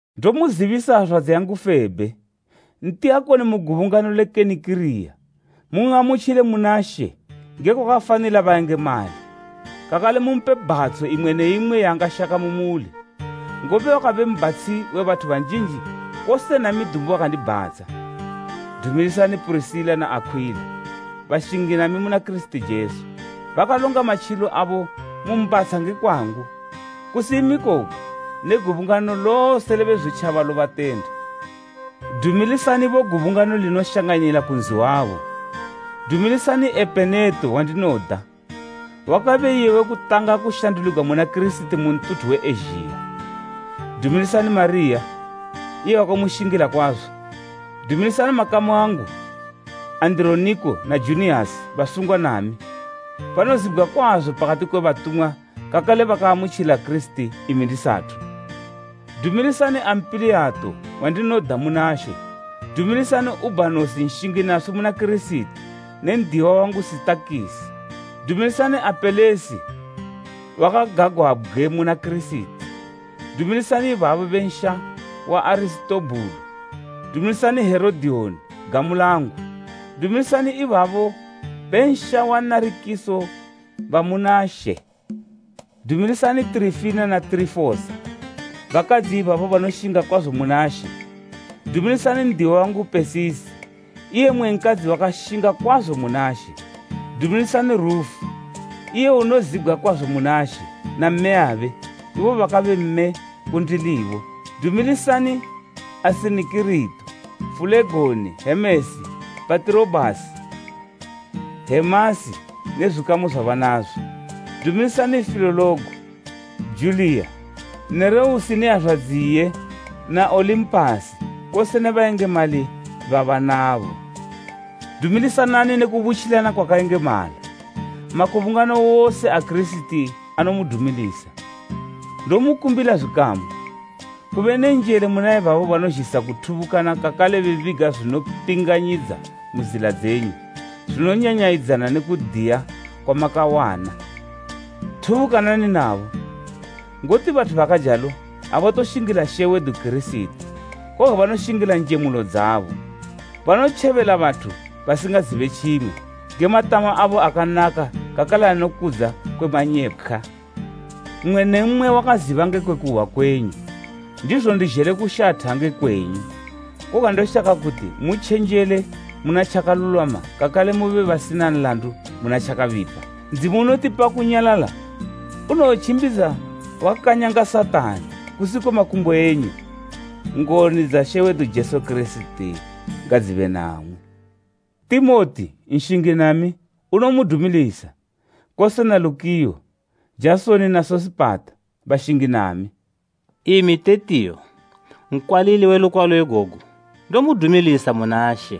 Ndomuzibisa hazwadzi yedu Febhe, ntiyakoni mu gubungano le Kenikiriya, mun'amutjile muna She nge kwakafanila bayengemali kakale mumpe bhatsho imwe ne imwe yaangashaka mu muli, ngobe wakabe mbatshi we bathu banjinji kose nami dumbu wakandibhatsha. Dumilisani Purisila na Akhwila, bashingi nami muna Kirisiti Jesu. Bakalonga matjilo abo mu mbhatsha nge kwangu. Kusi imi koga, ne gubungano lose le Bezwitjaba lobatenda. Dumilisanibo gubungano linoshanganila ku nzi wabo. Dumilisani Epeneto wandinoda, wakabe iye we kutanga kushanduligwa muna Kirisiti mu ntuthu we Ezhiya. Dumilisani Mariya iye wakamushingila kwazo. Dumilisani makamu angu Andironiko na Juniyasi basungwa nami. Banozibgwa kwazo pakati kwe batumwa kakale bakaamutjila Kirisiti imi ndisathu. Dumilisani Ampiliyato wandinoda muna She. Dumilisani Ubhanosi nshingi naswi muna Kirisiti ne n'diwa wangu Sitakisi. Dumilisani Apelesi wakagagwabgwe muna Kirisiti. Dumilisani ibabo be nsha wa Arisitobhulo. Dumilisani Herodiyoni gamu langu. Dumilisani ibabo be nsha wa Narikiso ba muna She. Dumilisani Tirifina na Tirifosa, bakadzi ibabo banoshinga kwazo muna She. Dumilisani n'diwa wangu Pesisi iye mmwe nkadzi wakashinga kwazo muna She. Dumilisani Rufu, iye unozibgwa kwazo muna She, na mmeyabe, ibo bakabe mme kundilibo. Dumilisani Asinikirito, Fulegoni, Hemesi, Patirobhasi, Hemasi ne zwikamu zwabanazo. Dumilisani Filologo, Juliya, Nereusi ne hazwadzi iye na Olimpasi kose ne bayengemali babanabo. Dumilisanani ne kubutjilana kwakayengemala. Makubungano wose a Kirisiti anomudumilisa. Ndomukumbila zwikamu, kube ne njele muna ibabo banozhisa kuthubukana kakale bebiga zwinopinganyidza mu zila dzenyu zwinonyanyayidzana ne kudiya kwamakawana. Thubukanani nabo. Ngoti bathu bakajalo abatoshingila She wedu Kirisiti, koga banoshingila njemulo dzabo. Banotjebela bathu basingazibe tjimwe nge matama abo akanaka kakale anokudza kwe manyepkhwa. Mmwe ne mmwe wakaziba ngekwe kuhwa kwenyu, ndizo ndizhele kushatha nge kwenyu, koga ndoshaka kuti mutjenjele muna tjakalulwama kakale mube basina nlandu muna tjakabipa. Ndzimu unotipa kunyalala unowotjimbidza wakanyanga Satani kusi kwe makumbo enyu. Ngoni dza She wedu Jesu Kirisiti ngadzibe namwi. Timoti, nshingi nami, unomudumilisa, kose na Lukiyo, Jasoni na Sosipata bashingi nami. Imi Tetiyo, nkwalili we lukwalo igogu, ndomudumilisa muna She.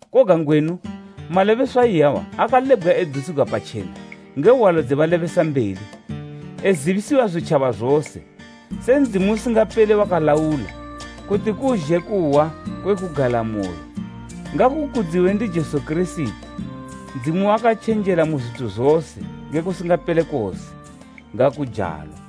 Koga ngwenu, malebeswa iyawa akalebgwa edusigwa patjena nge hwalo dze balebesambeli, ezibisiwa zwitjaba zose, se Ndzimu usingapele wakalaula, kuti kuzhe kuhwa kwe kugalamoyo. Ngakukudziwe ndi Jesu Kirisiti Ndzimu wakatjenjela mu zwithu zose nge kusingapele kose. Ngakujalo.